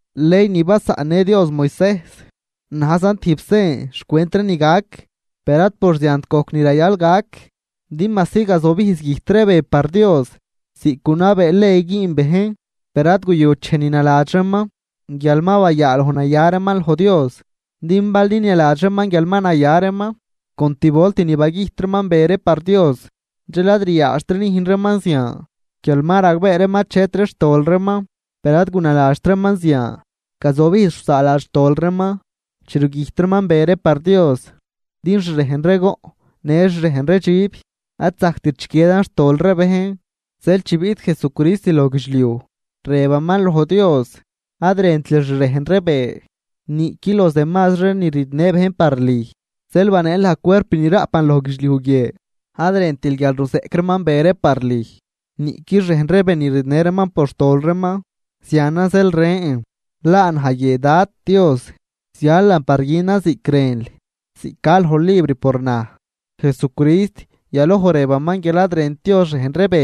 Ley ni basaꞌnnë Dios Moisejs najzan tijb sen xcwent ree ni gac, per ad por ziant gojc ni rayal gac. Din majsi gazobijz güjt ree be par Dios ziꞌc gunabee ley güün bejn, per ad guyut dxej ni naladx reeman guial ma bayaaloj naya reeman loj Dios. Din bal ninialadx reeman guial ma naya reeman con tib volt ni bagüjt reeman be ree par Dios, dxel ad ryaadxtri nüjn reeman zian guial ma ragbee reeman achetri xtol reeman. Per ad gunaladxt reeman zian, gazobijz rusaaladx xtol reeman chi rugüjt reeman be ree par Dios, din xrejn ree goꞌn në xrejn ree dxib ad zajct chiquiedan xtol ree bejn. Zeel chi biꞌt Jesucrist loj guidxliuj, rëbaman loj Dios: Ad rëntil xrejn ree be niꞌqui los demazri ree ni ridnë bejn par lüj, zeel baneel naj cuerp ni raꞌpan loj guidxliuj guie. Ad rëntril guial ruzeꞌc reeman be ree par lüj niꞌqui xrejn ree be ni ridnë reeman por xtol reeman. Zianan zeel rën: “Laa naj guie, Dad Dios, zialan par günan ziꞌc rënl, ziꞌc ca loj libr por naj.” Jesucrist yaloj rëbaman guial ad rënt Dios xrejn ree be,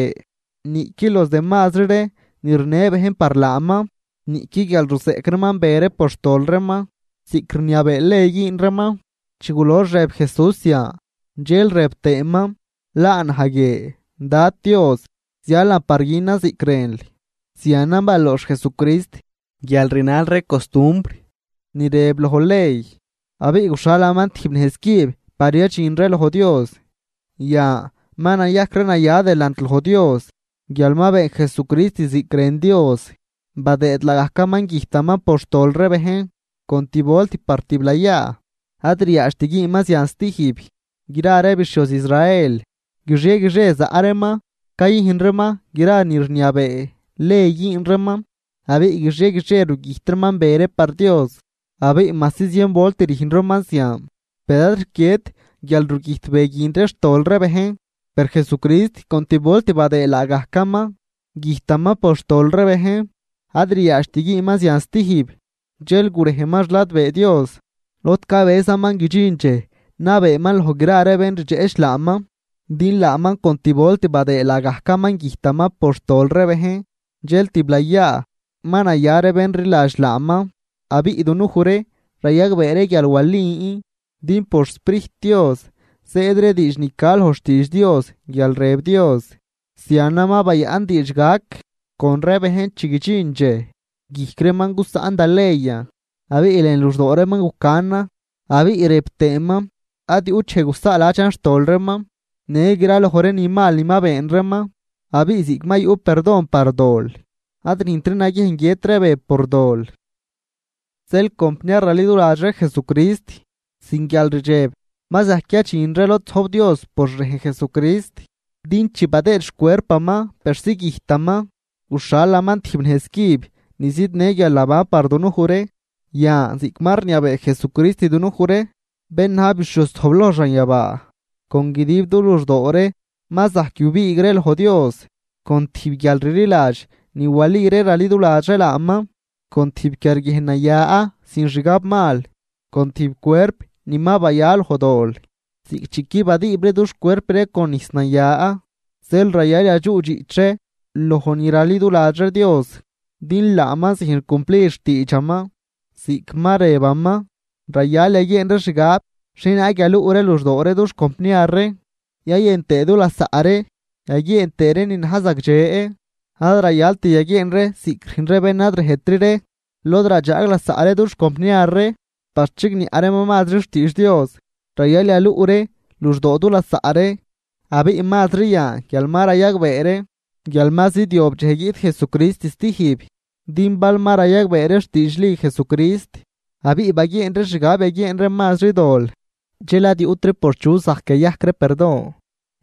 niꞌqui los demazri ree ni rinë bejn par laaman, niꞌqui guial ruzeꞌc reeman be ree por xtol reeman ziꞌc rniabee ley güün reeman. Chi gulox rëb Jesús zian, dxel rëb tëëman: “Laa naj guie, Dad Dios, zialan par günan ziꞌc rënl.” Zianan baloox Jesucrist guial rinal ree costumbr ni rëb loj ley abiꞌ guxhalaman tijb nejz cüb par yadxin ree loj Dios. Yan ma nayajc ree naya delant loj Dios guial ma been Jesucrist ziꞌc rën Dios, badëëd laagajcaman güjtaman por xtol ree bejn, con tib volt par tiblayaa, ad ryaadxt güünman zian stijb. Gra ree bixhioz Israel guixie guixie zaꞌ reeman cayüjn reeman gra ni rniabee ley güün reeman, abiꞌ guixie guixie rugüjt reeman be ree par Dios. Abiꞌ majsi zien volt rüjn reeman zian per ad rquiedt guialrugüjt be guin ree xtol ree bejn. Per Jesucrist con tib volt badëëd laagajcaman güjtaman por xtol ree bejn, ad ryaadxt güünman zian stijb. Dxel gurejman xladbee Dios, lod cabëzaman guidxin dxej nabeeman loj gra ree bén rdxeꞌch laaman. Din laaman con tib volt badëë laagajcaman güjtaman por xtol ree bejn dxel tiblayaa ma naya ree bén rliladx laaman. Abiꞌ dunuj ree rayagbee ree guial walin din por xSprijt Dios zëëd ree diidx ni ca loj xtiidx Dios guial rëb Dios: Zianan ma bayaꞌn diidx gac con ree bejn chi guidxin dxej: Guijc reeman gusaꞌn da leyan abiꞌ lën luxdoo reeman gucanan Abiꞌ rëb tëëman: Ad yuꞌt dxej gusaaladxan xtol reeman në graloj ree ni mal ni ma been reeman. Abiꞌ ziꞌc ma yuꞌ perdon par dol, ad rüjntri naguiejn guiët ree be por dol. Zeel compniar raliduladx ree Jesucrist sin guialrdxeb ma zajc yadxin ree lod zojb Dios por xrejn Jesucrist, din chi badëëd xcuerpaman persi güjtaman, guxhalaman tijb nejz cüb ni zidnë guialnaban par dunuj ree. Yan ziꞌc ma rniabee Jesucrist dunuj ree, bén na̱j bixhioz zojbloj xanyabaa, con guidib du luxdoo ree ma zajc yubiig ree loj Dios con tijb guialrliladx ni wali ree raliduladx ree laaman, con tijb quiarguiejn naya sin xgab mal, con tijb cuerp ni ma baya loj dol, ziꞌc chi qui badiibri dux cuerp ree con nijs naya. Zeel rayal yadxuꞌdxiꞌch ree loj ni raliduladx ree Dios, din laaman züjn cumplid xtiidxaman ziꞌc ma rëbaman. Rayal yaguieen ree xgab xhienaag yaluꞌ ree luxdoo ree dux compniar ree yayën tëë du lasaꞌ ree yaguieen tëë ree ni na̱j zagdxe. Ad rayalt yaguieen ree ziꞌc rüjn ree bén ad rejtri ree lod radxaag lasaꞌ ree dux compniar ree par chigniaꞌ reeman mazri xtiidx Dios, rayal yaluꞌ ree luxdoo du lasaꞌ ree, abiꞌ mazri yan guial ma rayagbee ree guial ma zidyob dxej guiꞌt Jesucrist stijb. Din bal ma rayagbee ree xtiidxli Jesucrist abiꞌ baguieen ree xgab yaguieen ree mazri dol, dxel ad yuꞌtri por chu zajc yayajc ree perdon.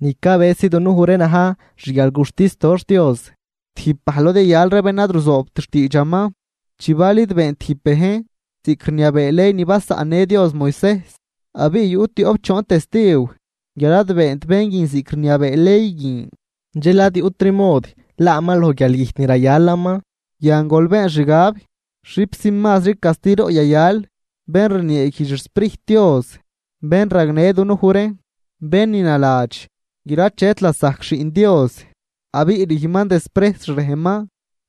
Ni cabësi dunuj ree na̱j xguialguxtis doxh Dios, tijb bajl lod yayal ree bén ad ruzoobt xtiidxaman. Chi bal id been tijb bejn ziꞌc rniabee ley ni basaꞌnnë Dios Moisejs, abiꞌ yuꞌ tioꞌp choon testiw guial ad beent bén guin ziꞌc rniabee ley guin, dxel ad yuꞌtri mod laaman loj guialgüjt ni rayalaman. Yan gol been xgab, ¡xipxi mazri castiroꞌ yayal bén rnieeguijdx xSprijt Dios bén ragnë dunuj ree! Bén ni naladx guial achet lasajc Xiꞌn Dios, abiꞌ rüjnman desprejs xrejnman,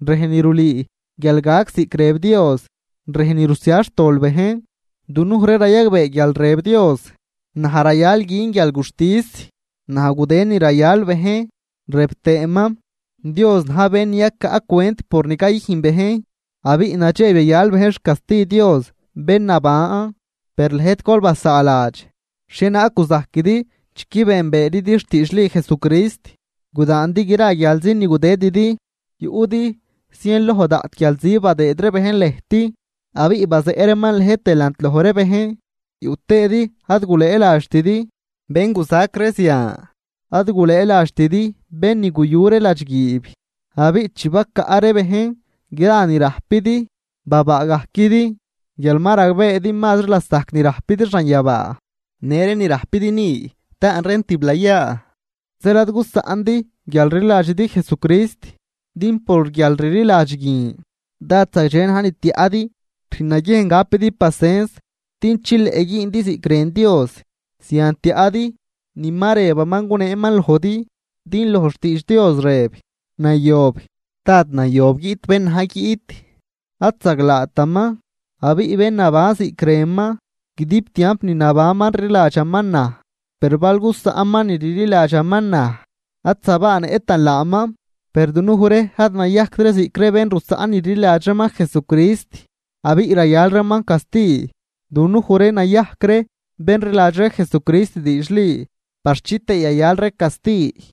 rejn ni rulüü guial gac ziꞌc rëb Dios, rejn ni rusia xtol bejn. Dunuj ree rayagbee guial rëb Dios: “Naj rayal gün guialguxtis, naj gudë ni rayal bejn.” Rëb tëëman: “Dios na̱j bén ni yacaꞌ cwent por ni cayüjn bejn.” ¡Abiꞌ nadxeb yayal bejn xcasti Dios bén naban! Per lëjt gol basaaladx xhienaag guzajquidi chi qui beenbeeridi xtiidxli Jesucrist. Gudaandi gra guialzi ni gudëdidi. Yuꞌdi zien loj daꞌt guialzi badëëd ree bejn lëjt, abiꞌ bazeꞌ reeman lëjt delant loj ree bejn, yuꞌ tëëdi ad gulëëladxtidi bén guzac ree zian. Ad gulëëladxtidi bén ni guyu ree ladxguiib, abiꞌ chi bacaꞌ ree bejn gra ni rajpidi, babaagajquidi guial ma ragbeedi mazri lasajc ni rajpidi xanyabaa, në ree ni rajpidi ni, taan reen tiblayaa. Zeel ad gusaꞌndi guialrliladxidi Jesucrist, din por guialrliladx guin dád zagdxe na̱j ni tiaꞌdi. Rüjn naguiejn gapidi pacens din chileꞌ güündi ziꞌc rën Dios, zian tiaꞌdi ni ma rëbaman guneeman lojdi. Din loj xtiidx Dios rëb: Nayob, dád nayob guiꞌt bén na̱j guiꞌt, ad zaglaataman. Abiꞌ bén naban ziꞌc rënan, guidib tiamp ni nabanman rliladxaman naj. Per bal gusaꞌnman ni rliladxaman naj, ad zabaanëꞌtan laaman. Per dunuj ree ad nayajct ree ziꞌc ree bén rusaꞌn ni rliladx reeman Jesucrist abiꞌ rayal reeman casti, dunuj ree nayajc ree bén rliladx Jesucrist diidxli par chitëë yayal ree casti.